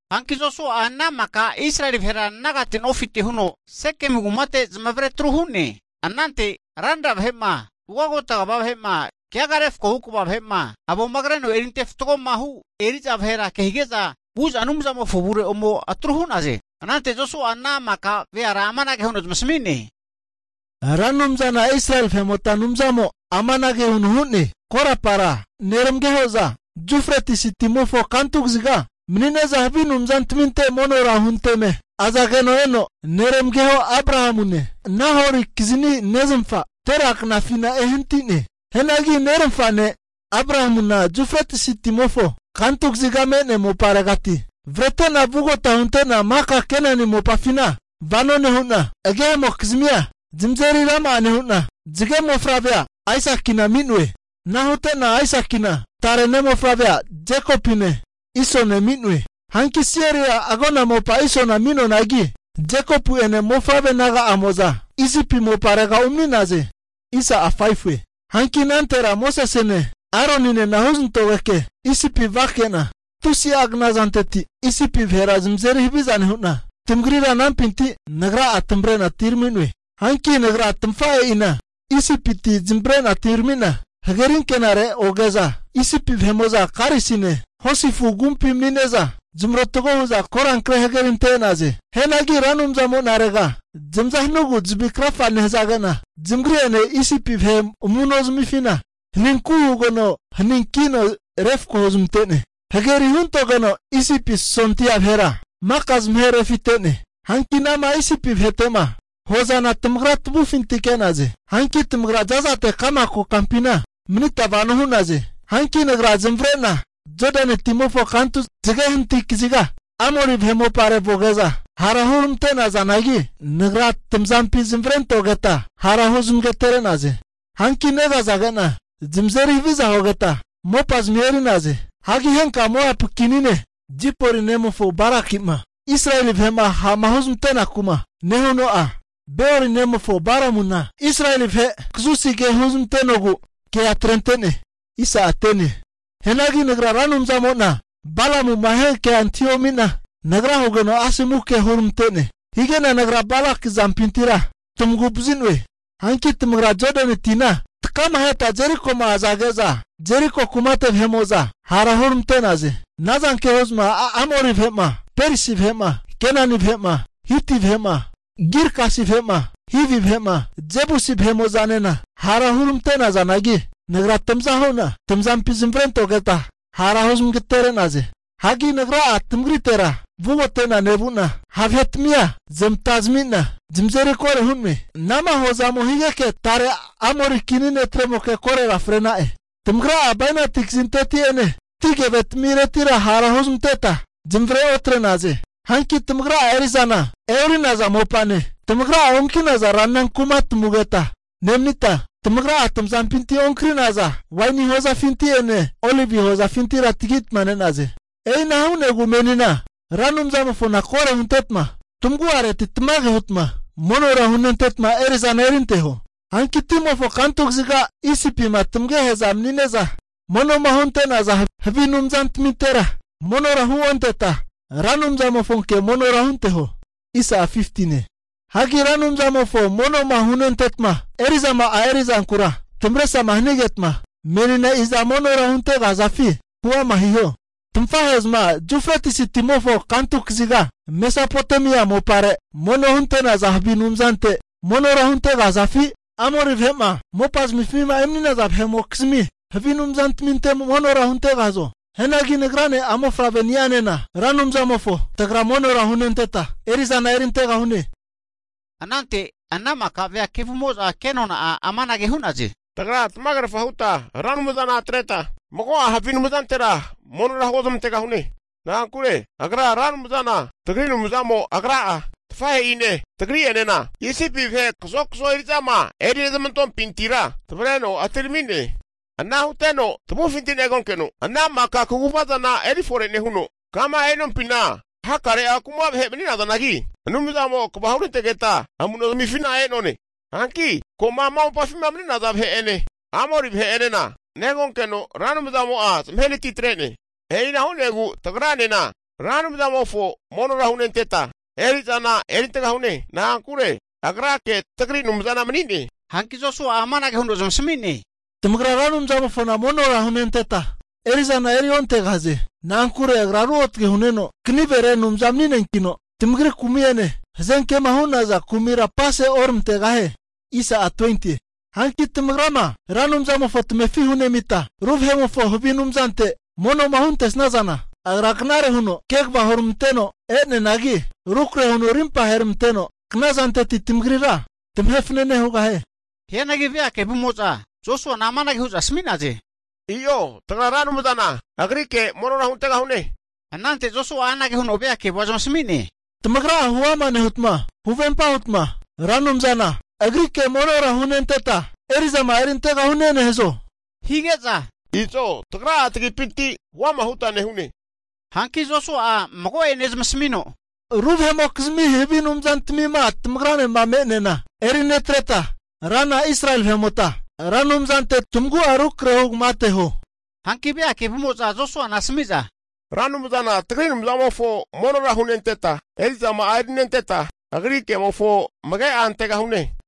Hanki Josua'a ana maka Israeli vahera nagate nofite huno Sekemu kumate zamavaretru hu'ne. Anante ranra vahe'ma, ugagota kva vahe'ma, keaga refkohu kva vahe'ma, avoma kreno eri antefatgoma hu eri'za vahera kehige'za vu'za Anumzamofo avure ome atru hu'naze. Anante Josua'a ana maka veara amanage huno zamasami'ne, Ra Anumzana Israeli vahe'mota Anumzamo amanage huno hu'ne, Korapara neramageho'za Yufretisi timofo kantu kaziga mani'ne'za havi anumzantaminte monora hunteme azageno eno, neramageho Abrahamune Nahori kizani neznafa Tera knafina ehanati'ne. Hianagi neramafa ne' Abrahamuna Yufretisi timofo kantu kaziga me'nea moparegati avrete'na vugota hunte'na maka Kenani mopafina vano nehu'na, agehe'mokizmia zamazeri rama'a nehu'na, zage mofavrea Aisakina ami'noe. Ana hute'na Aisakina tare ne' mofavrea Jekopune, Isone ami'noe. Hanki Seiria agona mopa Isona ami'noanagi, Jekopu'ene mofavre naga'amo'za Isipi moparega urami'naze. Hanki anantera Mosesene Aroninena huzanantogeke Isipi vake'na, tusia knazanteti Isipi vahera zamazeri haviza nehu'na, tamagrira anampinti Nagra'a tamavre'na atiramino'e. Hanki Nagra tamafahe'ina Isipiti zamavare'na atirami'na hagerinkenare oge'za, Isipi vahe'mo'za karisine hosi afu agumpi mani'ne'za zamarotgo hu'za korankre hagerinte e'naze. Hianagi Ra Anumzamo'narega zamaza hanugu zavi krafage nehazage'na, zamagri'ene Isipi vahe amu'nozamifina haninku hugeno haninkino refko huzmante'ne. Hageri huntogeno Isipi sondia vahera maka zamaherefite'ne. Hanki ana'ma Isipi vahete'ma huazana tamagra tamavufinti ke'naze. Hanki tamagra za'zate ka'ma kokampina manita vano hu'naze. Hanki Nagra zamavare'na Jodani timofo kantu zage hanati kaziga, Amori vahe mopare vuge'za, hara huramante'nazanagi Nagra tamazampi zamavarentogeta hara huzamagtere'naze. Hanki negazage'na zamazeri haviza hugeta, mopazamia eri'naze. Hagi henka Moapu kini ne' Zipori nemofo Baraki'ma Israeli vahe'ma ha'ma huzmanteku'ma nehuno'a, Beori nemofo Balamuna Israeli vahe kazusi ke huzmantenogu kea atrente'ne. Hianagi Nagra Ra Anumzamo'na Balamu'ma hiankea antahiomi'na, nagra hugeno asomu ke huramante'ne. Hige'na Nagra Balaki azampintira tamagu'vazi'noe. Hanki tamagra Jodani tima takahetama Jerikoma azage'za, Jeriko kumate vahe'mo'za hara hurmante'naze. Ana zanke hu'za Amori vahe'ma, Perisi vahe'ma, Kenani vahe'ma, Hiti vahe'ma, Girgasi vahe'ma, Hivi vahe'ma, Jebusi vahe'mo'zanena hara hurmante'nazanagi, Nagra tamaza hu'na tamazampi zamavarentogeta hara huzmagatere'naze. Hagi Nagra'a tamagritera vugote'na nevu'na ha' vahe'tmia zamatazamina, zamazeri koro hu'noe. Ana'ma huazamo higeke tare Amori kini netremokea korora fre'na'e. Tamagra'a bainati kazinteti'ene ati keve tamiretira hara huznanteta zanavre otre'naze. Hanki tamagra'a eri'zana e'ori'naza mopane, tamagra'a onki'naza ranra kumatamugeta nemanita, tamagra'a tamazampinti onkri'naza waini hozafinti'ene olivi hozafintira tagitma ne'naze. E'ina hu'negu menina Ra Anumzamofona koro huntetma tamagu'areti tamage hutma monora hunenteta eri'zana erinteho. Hagi timofo kantu kaziga Isipima tamagehe'zama mani'ne'za mono'ma hunte'naza havi anumzantamintera monora huonteta, Ra Anumzamofonke monora hunteho. Hagi Ra Anumzamofo mono'ma hunenteta eri'zama erinte'zanku'ma tamavesrama hanigeta menina iza monora huntegahazafi huama hiho. Tamafahe'zama Yufretisi timofo kantu kaziga Mesapotomia mopare mono hunte'naza havi anumzante monora huntegahazafi, Amori vahe'ma mopazamifima emani'naza vahe'mokizmi havi anumzantaminte monora huntegahazo? Hianagi nagrane a'mofavre ni'anena, Ra Anumzamofo tagra monora hunenteta eri'zana erintegahune. Anante ana maka vea kevumo'za kenona'a amanage hu'naze, tagra tamagerafa huta Ra Anumzana atreta mago'a havi anumzantera monora huozmantegahune. Na'ankure Agra Ra Anumzana tagri Anumzamo Agra'a, tafahe'ine tagri'enena Isipi vahe kazokzo eri'zama erinezmantompintira tavreno etirami'ne. Ana huteno tavufinti negonkeno, ana maka kaguvazana eri fore nehuno, kama e'nompina hakare'a kuma vahe mani'nazanagi Anumzamo'a kva hurantegeta amu'nozmifina e'none. Hanki ko'ma ama mopafima mani'naza vahe'ene, Amori vahe'enena negonkeno Ra Anumzamo'a zamahenati atre'ne. E'ina hu'negu tagranena Ra Anumzamofo monora hunenteta eri'zama'a erintegahune. Na'ankure Agrake tagri Anumzana mani'ne. Hanki Josua'a amanage huno zamasami'ne, Tamagra Ra Anumzamofona monora hunenteta eri'zana eriontegahaze. Na'ankure Agra ruotage hu'neno, kanivere Anumza mani'neankino, tamagri kumi'ene, hazenkema hu'naza kumira apase oramantegahie. Hanki tamagrama Ra Anumzamofo tamefi hunemita, ru vahe'mofo havi anumzantaminte mono'ma huntesnazana, Agra knare huno kegava huramanteno e'neanagi, rukrahe huno rimpa aheneramanteno knazanteti tamagrira tamahe fanane hugahie. Hianagi vea kevumo'za Josuana amanage hu'za asmi'naze, i'o tagra Ra Anumzana Agrike monora huntegahune. Anante Josua'a anage huno vea kevua zamasami'ne, tamagra'a huama nehutma, huvempa hutma Ra Anumzana Agrike monora hunenteta eri'zama'a erintegahune nehazo? Hige'za, izo tagra'a tagipinti huama huta nehune. Hanki Josua'a mago'ane zamasamino, ru vahe'mokizmi havi anumzantamima tamagranema me'neana eri netreta, Rana Israeli vahe'mota Ra Anumzante tamagu'a rukrahe huta amage anteho. Hanki vea kevumo'za Josuana asami'za, Ra Anumzana tagri Anumzamofo monora hunenteta, eri'zama'a erinenteta, Agri kemofo amage'a antegahune.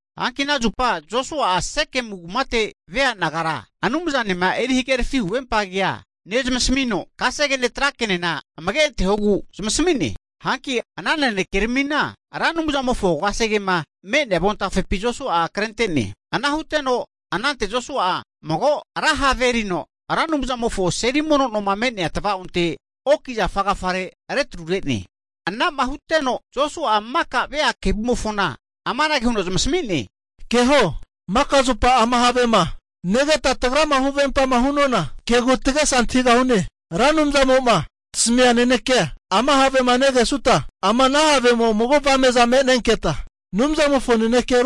Hanki ana zupa Josua'a Sekemu kumate vea nagara Anumzanema huhagerafi huvempa kea nezamasamino, kasegene tra kenena amage antehogu zamasami'ne. Hanki ana nanekeramina Ra Anumzamofo kasegema me'nea avontafepi Josua'a krente'ne. Ana huteno, anante Josua'a mago ra have erino Ra Anumzamofo seli mono noma me'nea tavaonte oki zafa agafare retrure'ne. Anama huteno Josua'a maka vea kevumofona amanage huno zamasami'ne, keho, maka zupa ama havema negeta tagrama huvempama hu'nona kegu tagesa antahigahune. Ra Anumzamo'ma tasamia nanekea ama havema negesuta, ama ana havemo mago avame'za me'nenketa Anumzamofo nanekea ruotagregahune.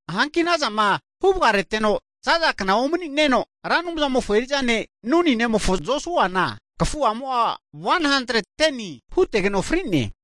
Hanki anazama huvagareteno zaza kna omani'neno Ra Anumzamofo eri'za ne' Nuni nemofo Josuana, kafu'amo'a 110ni hutegeno fri'ne.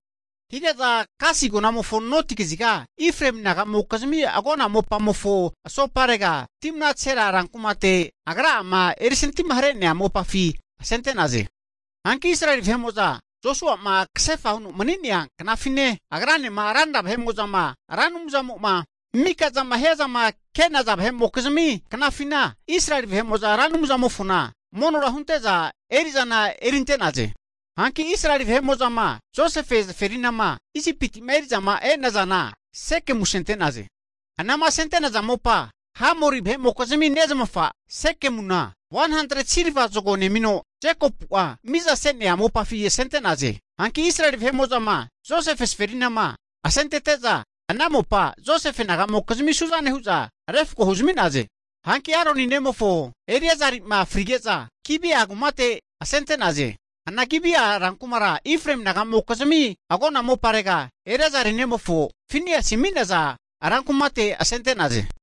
Hige'za Gasi agonamofo noti kaziga Efraemi naga'mokizmi agona mopamofo asoparega, Timnat Sera rankumate agra'ama erisantimahare'nea mopafi asente'naze. Hanki Israeli vahe'mo'za Josua'ma kasefa huno mani'nea knafine, agranema ranra vahe'mo'zama Ra Anumzamo'ma mikazama hiazama ke'naza vahe'mokizmi knafina Israeli vahe'mo'za Ra Anumzamofona monora hunte'za eri'zana erinte'naze. Hanki Israeli vahe'mo'zama Josefe zaferinama Isipiti'ma eri'zama e'nazana Sekemu asente'naze. Anama asente'naza mopa Hamori vahe'mokizmi nezamafa Sekemuna 100'a silva zago nemino Jekopu'a mizase'nea mopafi asente'naze. Hanki Israeli vahe'mo'zama Josefe zaferinama asentete'za, ana mopa Josefe naga'mokizmi su'zane hu'za refko huzmi'naze. Hanki Aroni nemofo Eleaza'ma frige'za Gibea kumate asente'naze. Ana Gibea rankumara Efraemi naga'mokizmi agona moparega Eleazari nemofo Finiasi ami'naza rankumate asente'naze.